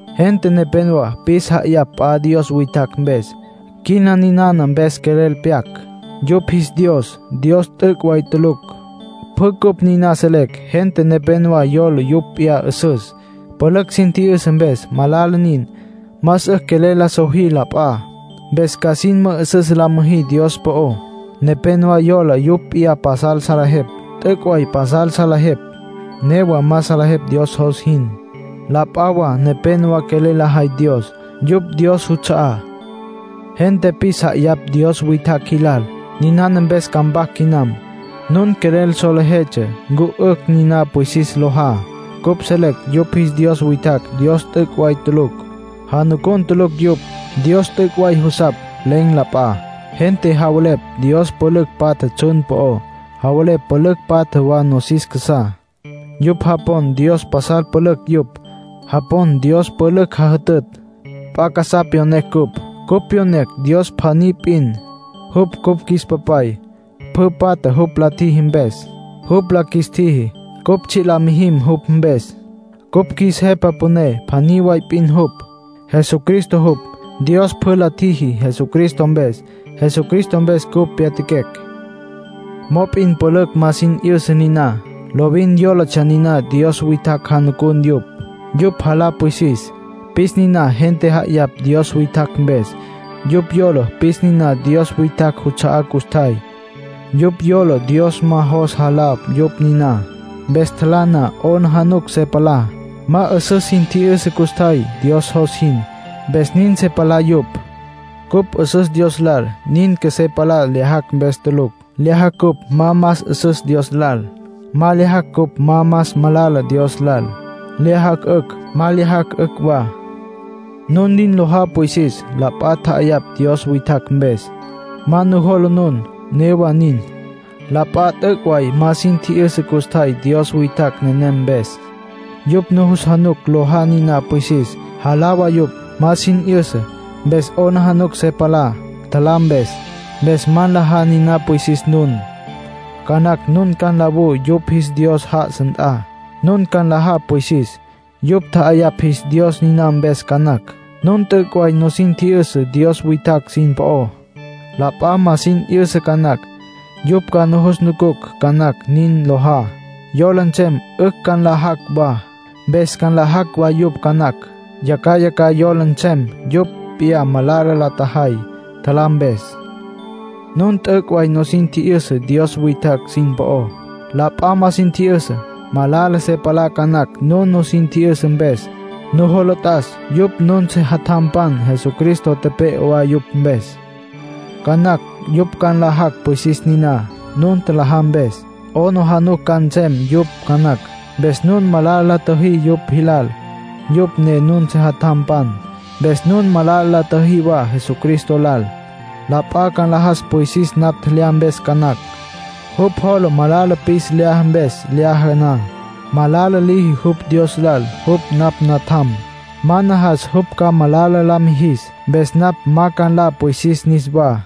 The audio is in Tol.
Gente nepénowa pis ja'ayapj p'a dios witjacj mpes. Quina ninana mpes quelel pyac. Yupj jis dios Dios t'üc' way tulucj. Pjü cupj niná selecj. Gente nepénowa yola yupj p'iyá 'üsüs, pülücj sin tji'yüsa mpes. Malala nin. Más 'ücj quelel la sojí la p'a. Mpes ca sin mü'üsüs la müjí Dios po'ó. Nepénowa yola yupj p'iyá pasal salejepj. T'üc' way pasal salejepj. Newa ma salejepj Dios jos jin. La p'a wa nepenowá quelel lajay Dios. Yupj Dios juts'a'á. Gente pis ja'ayapj dios witjacj jilal. Niná mpes ca mpac quinam. Nun quelel solejetsja ncu 'ücj niná pwisis lojá. Cupj selecj yupj jis dios witjacj Dios t'üc' way tulucj. Janucun tulucj yupj. Dios t'üc' way jusapj. Len̈ la p'a. Gente javelepj dios pülücj patja tsjun po'ó. Javelepj pülücj patja wa nosis casá. Yupj japon dios pasal pülücj yupj. Japon dios pülücj jajütütj. P'a casá pyonecj cupj. Cupj pyonecj Dios pjaní p'in. Jupj cupj qjuis Papay. Pjü patja jupj la tjiji mpes. Jupj la qjuis tjiji, cupj tsji' la mijim jupj mpes. Cupj qjuis Jepa Püné pjaní wa p'in jupj, Jesucristo jupj. Dios pjü la tjiji Jesucristo mpes. Jesucristo mpes cupj pyatjaquecj. Mop'in pülücj ma sin tji'yüsa niná. Lovin yólatsja niná dios witjacj janucun yupj. Yupj jalá pwisis, pis niná gente tja'ayapj dios witjacj mpes. Yupj yola pis niná dios witjacj juts'a'á custjay. Yupj yola Dios ma jos jalá yupj niná, mpes tjalá na, 'aplijila se palá. Ma 'üsüs sin tji'yüsa custjay Dios jos jin, mpes nin se palá yupj. Cupj 'üsüs Dios lal, nin qjuesé palá tjelyajacj mpes tulucj. Lyajacj, cupj ma más 'üsüs Dios lal. Ma lyajacj, cupj ma más malala Dios lal. Lyajacj, 'ücj. Ma lyajacj, 'ücj wa. Nun nin lojá pwisis, la p'a tja'ayapj dios witjacj mpes. Ma nujola nun. Newa nin, la p'a t'üc' way ma sin tji'yüsa custjay dios witjacj nenem mpes. Yupj nujus januc lojá niná pwisis. Jalá wa yupj. Ma sin 'yüsa, mpes 'aplijila se palá tjalá mpes. Mpes ma nlajá niná pwisis nun. Ca nacj nun ca nlawú yupj jis dios já'asa nt'a. Nun ca nlajá pwisis, yupj tja'ayapj jis dios niná mpes ca nacj. Nun t'üc' way nusin tji'yüsa dios witjacj sin po'ó. La p'a ma sin 'yüsa ca nacj. Yupj ca nujus nucucj ca nacj nin lojá. Yola nsem 'ücj ca nlajacj wa. Mpes nlajacj wa yupj ca nacj. Yacjaya ca yola nsem yupj p'iyá malala la tjajay, tjalá mpes. Nun t'üc' way nusin tji'yüsa dios witjacj sin po'ó. La p'a ma sin tji'yüsa. Malala se palá ca nacj nun nusin tji'yüsa mpes. Nujola t'as, yupj nun sejatjampan, Jesucristo tepe'e wa yupj mpes. Ca nacj yupj ca nlajacj pwisis niná, nun tjalajá mpes. 'Aplijila ca nsem yupj ca nacj. Mpes nun malala la tjüjí yupj jilal, yupj ne nun sejatjampan. Mpes nun malala la tjüjí wa Jesucristo lal. La p'a ca nlajas pwisis napj tjelyá mpes ca nacj. Jupj jola malala pis lyaja, mpes lyaja na, malala liji jupj Dios lal. Jupj napj natjam. Ma najas jupj ca malala la mijis, mpes napj ma ca nla pwisis niswá.